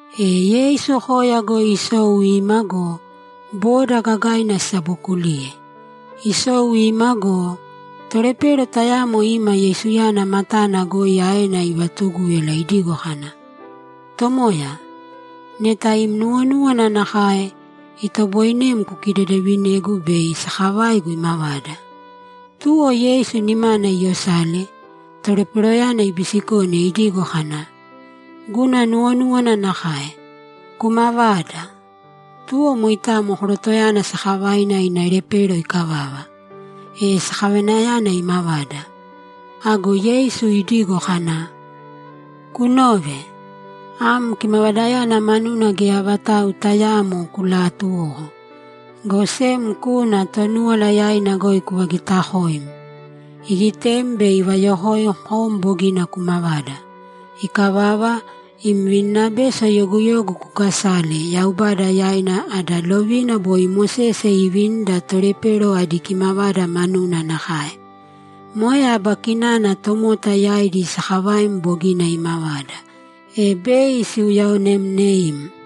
E Yeisu koya goi isou ima go, boda gagaina sisabokuliye. Isou ima go, tolepero tayamo ima Yeisuyana matana goi aena ivaatugúyala idigo kana, ‘Tomoya, neta im nuwonúwana nakae, itoboinem kukidedevinegu bei sakavaigu imavada.’ Tuwo Yeisu nimana iyosale, toleperoyana ibisikone idigo kana, ‘Guna nuwonúwana nakae. Kumavāda!’ Tuwo mainao korotoyana sakavaina ina lepero ikavava, e sakavainayana imavada. Ago Yeisu idigo kana, ‘Kunōve. Am kimavadayana manuna geya vatau tayaamo kulaatuwōko, go sem kūna Tonúwala yaina goi kuvagitakōim, igitem bei ivayokoim kom bogina kumavada. Ikavava, im vininabeso yoguyogu kukasāle Yaubada yaina ada lovina boi Mosese iivinida tolepero adi kimavada manuna nakae. Moe aba kinana tomota yaidi sakavaim bogina imavada, e bei siuyaonemneim.’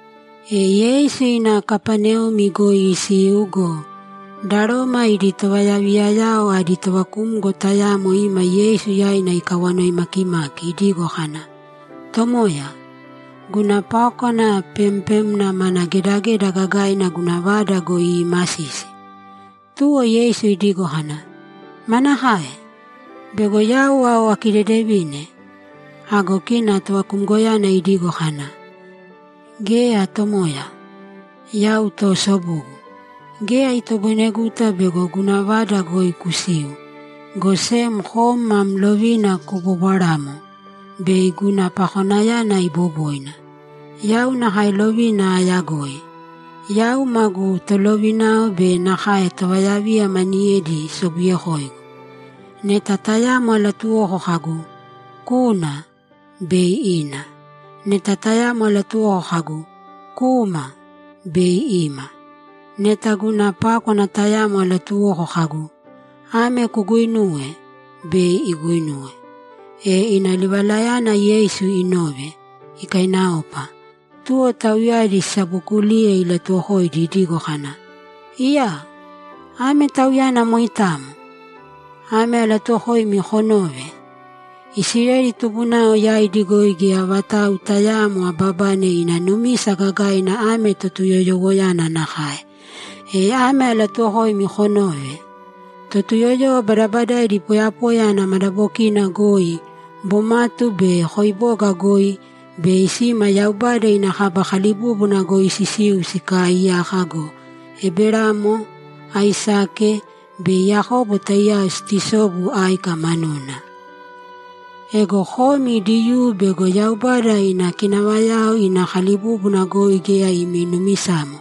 E Yeisu ina Kapaneumi goi isiu go, da Roma idi tovayaviyayao adi tovakumgo tayamo ima Yeisu yaina ikawanoi makimaki idigo kana, ‘Tomoya, guna pákwana pempemna mana gedageda gagaina guna vada goi iimasisi.’ Tuwo Yeisu idigo kana, ‘Manakae? Bego yau ao akidedevine?’ Ago kina tovakumgoyana idigo kana, ‘Geya, Tomoya. Yau toosobugu; geya itoboineguta bego guna vada goi kusiu, go sem kom mam lovina kubobwarāmo, bei guna pakonayana iboboina. Yau nakae lovina ayagoi. Yau magu tolovinao be nakae tovayaviya maniyedi sobuyekoigu. Neta tayamo alatuwoko kagu, “Kūna!” bei ina. Neta tayamo alatuwoko kagu, “Kūma!” bei ima. Neta guna pákwana tayamo alatuwoko kagu, “Ame kuguinūwe!” bei iguinuwe.’ E ina livalayana Yeisu inove, ikainaopa. Tuwo tauyadi sisabookuliye ilatuwokoidi idigo kana, ‘Iyaa! Ame tauyana moitamo! Ame alatuuwokoimi konōve: Isileli tubunao yaidi goi geya vatau tayaamo ababane ina numisa gagaina ame Totuyoyowoyana nakae. E ame alatuuwokoimi konōve: Totuyoyowo badabadaidi poyapoya ana madabokina goi, bomatu be koiboga goi, bei sima Yaubada ina kaba kalibúbuna goi sisiu sikaaiyaka go, Eberamo, Aisake be Yakobo taiyao situsobu áika manuna. Ego komi Diyuu bego Yaubada ina kinavayao ina kalibúbuna goi geya imi numisamo,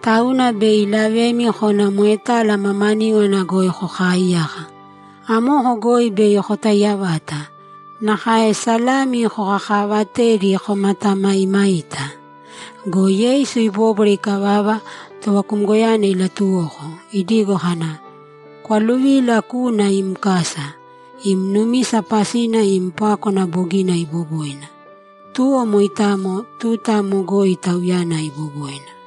tauna bei ilavemi kona moetala mamaníwana goi kokaaiyaka. Amoko goi bei kotaiya vata, nakae salami kokakaavatedi komatamaimaita.’ Go Yeisu ibóbwara ikavava, tovakumgoyana ilatuwoko, idigo kana, ‘Kwaluvīla kūna im kasa. Im numisa pasina im pákwana bogina iboboina.’ Tuwo moitamo, tuta amo goi tauyana iboboina.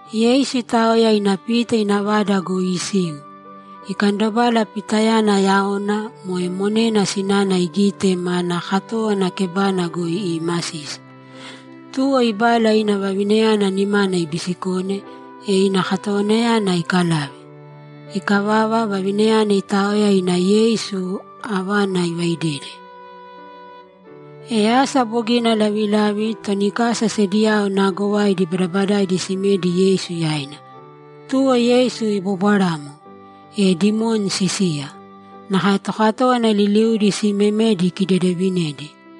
Yeisu itaoya ina Pita ina vada goi isiu, ikandobala Pitayana yaona (moe monena sinana) igite manaa katówana kebana goi iimasisi. Tuwo ibala ina vavinayana nimana ibisikone, e ina katowanayana ikalave. Ikavava, vavinayana itaoya ina Yeisu avana ivaidede. E asa bogina lavilavi, toni kasa sediyao naagovaidi badabadaidi simedi Yeisu yaina. Tuwo Yeisu ibobwaramo, e dimoni sisiya. Nakae tokatówana liliudi simemedi ikidedevinedi.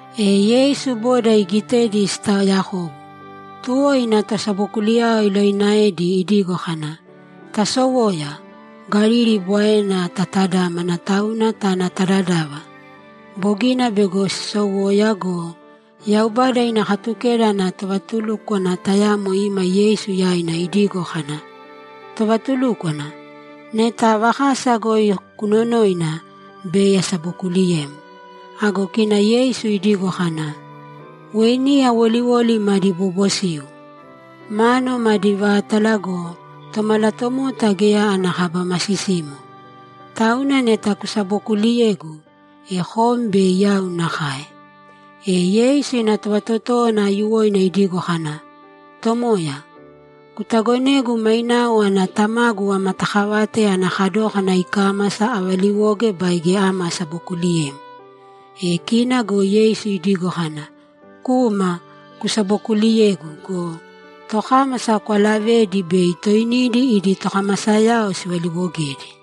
E Yeisu boda igitedi sitaaoyakobu, tuwo ina tosabokuliyao ilovinaedi idigo kana, ‘Tasowōya, Galili Bwaena tatadamāne tāna ta dadava.’ Bogina bego sisowoya go, Yaubada ina Katukeda ana tovatulúkwana tayamo ima Yeisu yaina idigo kana, ‘Tovatulúkwana, neta ava kasa goi kunonoina, bei asabokuuliyem.’ Ago kina Yeisu idigo kana, ‘Weiniya woliwoli madi bobosiu, mánuwo madi vátala go, Tomalatomota geya ana kaba masisimo. Tauna neta kusabokuuliyegu, e kom bei yau nakae.’ E Yeisu ina tovatotówana aiyuwoina idigo kana, ‘Tomoya, kutagonēgu mainao ana tamagu amatakavate ana kadókana ikámasa avaliwoge baige ama asabokuliyem.’ E kina go Yeisu idigo kana, ‘Kūma kusabokuliyēgu go, tokámasa kwalavēdi bei toinidi idi tokamasayao sivaliiwogedi.’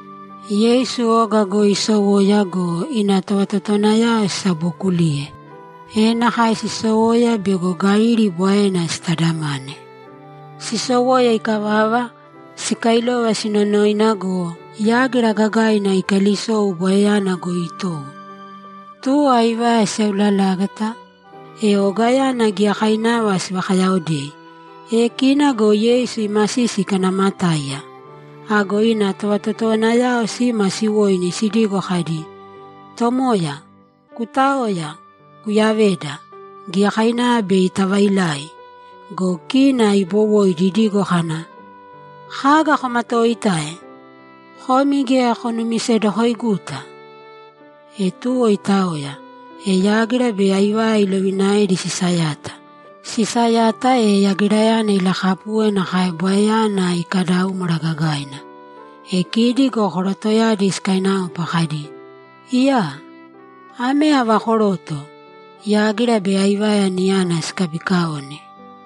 Yeisu oga goi isowoya go, ina tovatotowanayao sisabookuliye, e nakae sisowoya bego Galili Bwaena sitadamane. Sisowoya ikavava, sikailova sinonoina go, yágira gagaina ikalisou Bwaeyana goi itowo. Tuwo aivaya siseulalágata, e ogayana giyakainava sivakayaaodei. E kina go Yeisu imasisi ikanaamatáiya. Ago ina tovatotowanayao sima siwoini sidigo kadi, ‘Tomooya, kutāoya kuyavēda! Giyakainava bei tavailai!’ Go kina ibowoidi idigo kana, ‘Kaga komatoitae? Komi geya konumisedokoiguta!’ E tuwo itaoya, e yágira be aivaya ilovinaedi sisayata. Sisayata, e yagirayana ilakapuwe nakae Bwaeyana ikadaúmwara gagaina. E kidi go korotoyadi sikainaopa kadi, ‘Iyaa! Ame ava koroto? Yágira be aivaya niyana sikabiikaone?’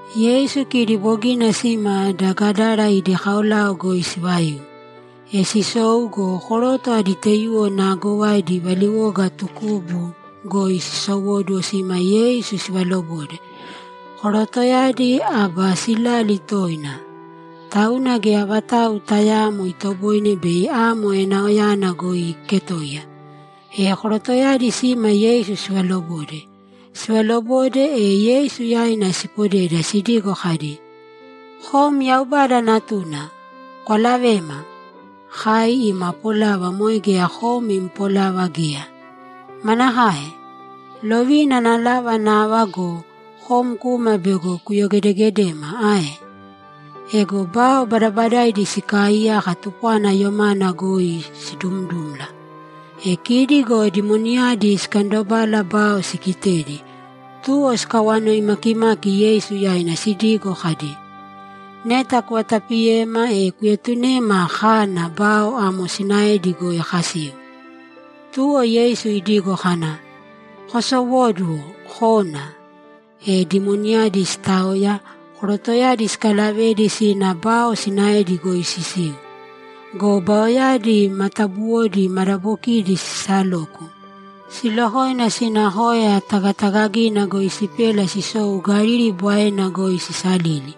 Yeisu kidi bogina sima da Gadara idi kaolao goi sivaiu. E sisou go, koroto adi taiyuwo naagovaidi valiwoga tukubu goi sisowóduwo sima Yeisu sivalobode. Korotoyadi aba silali toina, tauna geya vatau tayaamo itoboine bei amo enaoyana goi iiketoiya. E korotoyadi sima Yeisu sivalobode. Sivalobode, e Yeisu yaina sipodeda sidigo kadi, ‘Kom Yaubada Natuna, kwalavēma! Kai ima polava moe geya kom im polava geya. Manakae? Lovina ana lava nava go, kom kuma bego kuyogedegedema ae?’ Ego bao badabadaidi sikaaiyaka tupwana yomana goi sidumdumla. E kidi go dimoniyadi sikandobala bao sigitedi, tuwo sikawanoi makimaki Yeisu yaina sidigo kadi, ‘Neta kuvatapiyema, e kuetunēma kāna bao amo sinaedi goi kasiu.’ Tuwo Yeisu idigo kana, ‘Kosowōduwo kōna!’ E dimoniyadi sitaoya, korotoyadi sikalavedi sina bao sinaedi goi sisiu. Go baoyadi matabuwodi madabokidi sisaloku, silokoina sina koya tagatagagina goi sipela sisou Galili Bwaena goi sisalili.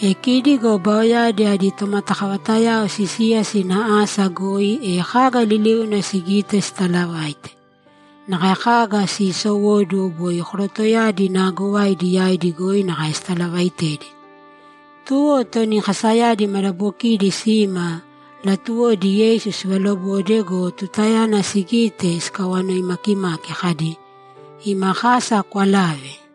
E kidi go baoyadi adi tomatakavatayao sisiya sina asa goi, e kaga liliuna sigite sitalavaite. Nakae kaga siisowóduwo boi korotoyadi naagovaidi yaidi goi nakae sitalavaitedi. Tuwo toni kasayadi madabokiidi sima; latuwodi Yeisu sivalobode go, tutayana sigite, sikawanoi makimaki kadi, ‘Ima kasa kwalāve!’